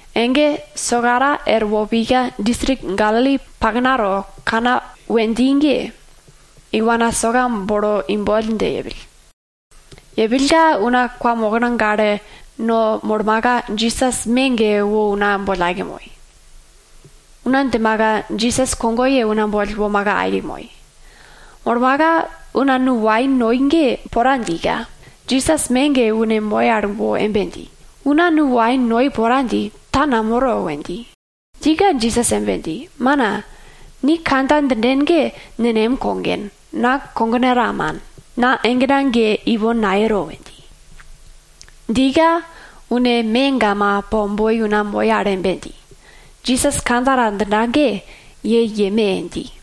Ege sokara erwo pika, distrik Galili paknato Kana we dji ge, iwana soka bolo imboll dje yepill. Yepillka una kwamokna gale no molmaka, Jisas me ge wo una boll aike moi. Una djimaka Jisas kogoye una boll womaka aike moi. Molmaka, una nu wain noi ge pora djika, Jisas me ge une moi al wo embe dji, una nu wain noi pora dji, ta namoro we dji. Djika Jisas embe dji, mana, ni kandja djinden ge nenem kogen, na kogena ta man. Na egena ge ipon nayero we dji. Djika une megama po boi una moi al embe dji, Jisas kandja ta djinda ge, ye yeme dji.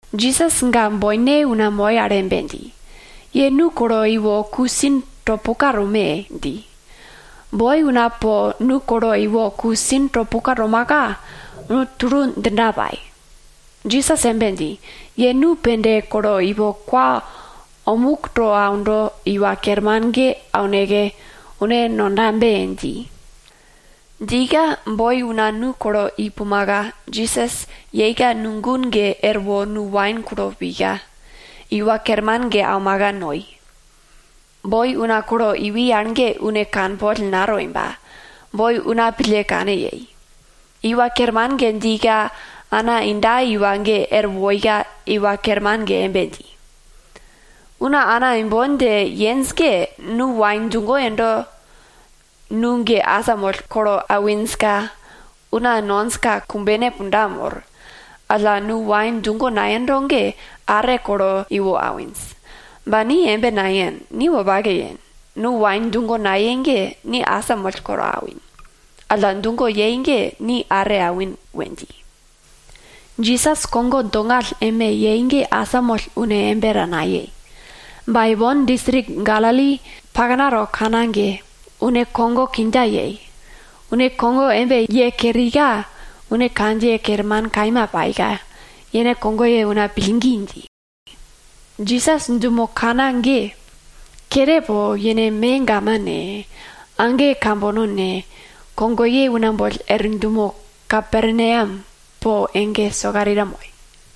Jisas ga boine una moi al embe dji, ye nu kolo iwo ku sin to puka tome! dji. Boi una po nu kolo iwo ku sin to puka tomaka, nu tulu djinda pai. Jisas embe dji, ye nu pende kolo ipo kwa omuk to aundo iwa kerman ge auneke, une nondabe dji. Djika boi una nu kolo i pumaka, Jisas yeika nu gun ge erwo nu wain kulo pika, iwa kerman ge aumaka noi. Boi una kolo iwi al ge une kanpol natoi ba, boi una pille kane yei. Iwa kerman ge djika ana inda iwa ge er woika iwa kerman ge embe dji, una ana imbon dje yenj ge, nu wain djugo yendo nu ge asamoll kolo awinjka, una nonjka kumbene punda mor. Alla, nu wain djugo nayendo ge are kolo iwo awinj. Ba, ni embe nayen, ni wopake yen. Nu wain djugo nayei ge, ni asamoll kolo awin, alla djugo yei ge ni are awin we dji. Jisas kogo dongall embe yei ge asamoll une embe ta nayei. Ba ipon distrik Galili paknato Kana ge, une kogo kindja yei. Une kogo embe ye kerika, une kandjiye kerman kaima paika, yene kogoye una pillgi dji. Jisas dumo Kana ge, kere po yene megama ne, age kambono ne, kogoye una boll er dumo Kaperneam po ege sokarita moi.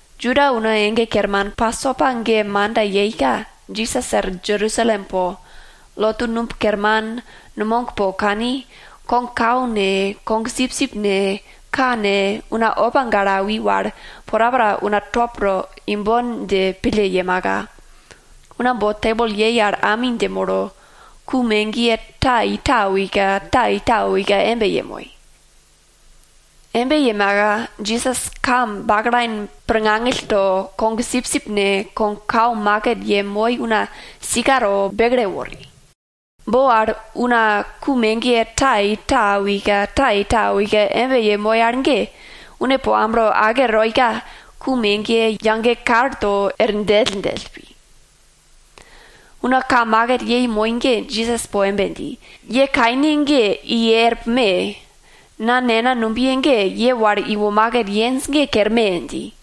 Juda una ege kerman Pasopa ge manda yeika, Jisas er Jerusalem po lotu numb kerman, numog po kani, kogkau ne, kogsipsip ne, ka ne, una opa gale awi wal porapora una top to imbon dje pille yemaka, una bo tebol yei al ami dje molo, ku megiye ta i ta awika, ta i ta awika embe yemoi. Embe yemaka Jisas ka baklain pirngangill to, kogsipsip ne, kogkau iwo yemoi una sika to bekle wori. Bo al una ku megiye ta i ta awika, ta i ta awika embe yemoi al ge, une po amblo ake toika, ku megiye tulu dje er djelldjell pi. Una ka maket yemoi ge Jisas po embe dji, ye kaine ge i er pume! Na Nena numbiye ge, ye wal iwo maket yenj ge kerme! dji.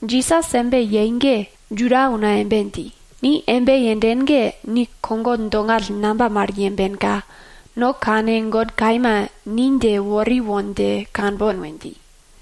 Jisas embe yei ge Juda una embe dji, ni embe yenden ge, ni kogo dongall namba mal yembenka, no kane God kaima ni dje wori won dje kanbon we dji.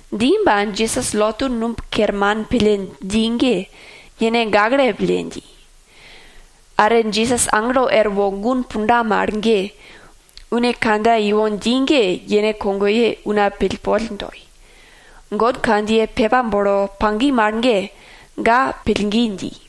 Dji ba, Jisas lotu numb kerman pille dji ge, yene gakle pille dji. Are Jisas aglo erwo gun punda mal ge, une kandja ipon dji ge yene kogoye una pillpol toi. God kandjiye pepa bolo pagi mal ge, ga pillgi dji.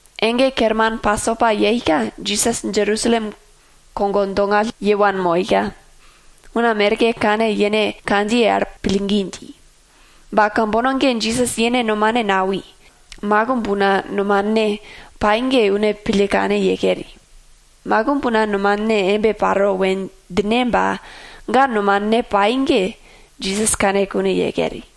Ege kerman Pasopa yeika, Jisas Jerusalem kogo dongall ye wanmoika, una merke kane yene kandjiye al pillgi dji. Ba kambono ge Jisas yene nomane nawi, makimb una nomane pai ge une pille kane ye keri. Makimb una nomane embe paro we djine ba, ga nomane pai ge, Jisas kane kune ye keri.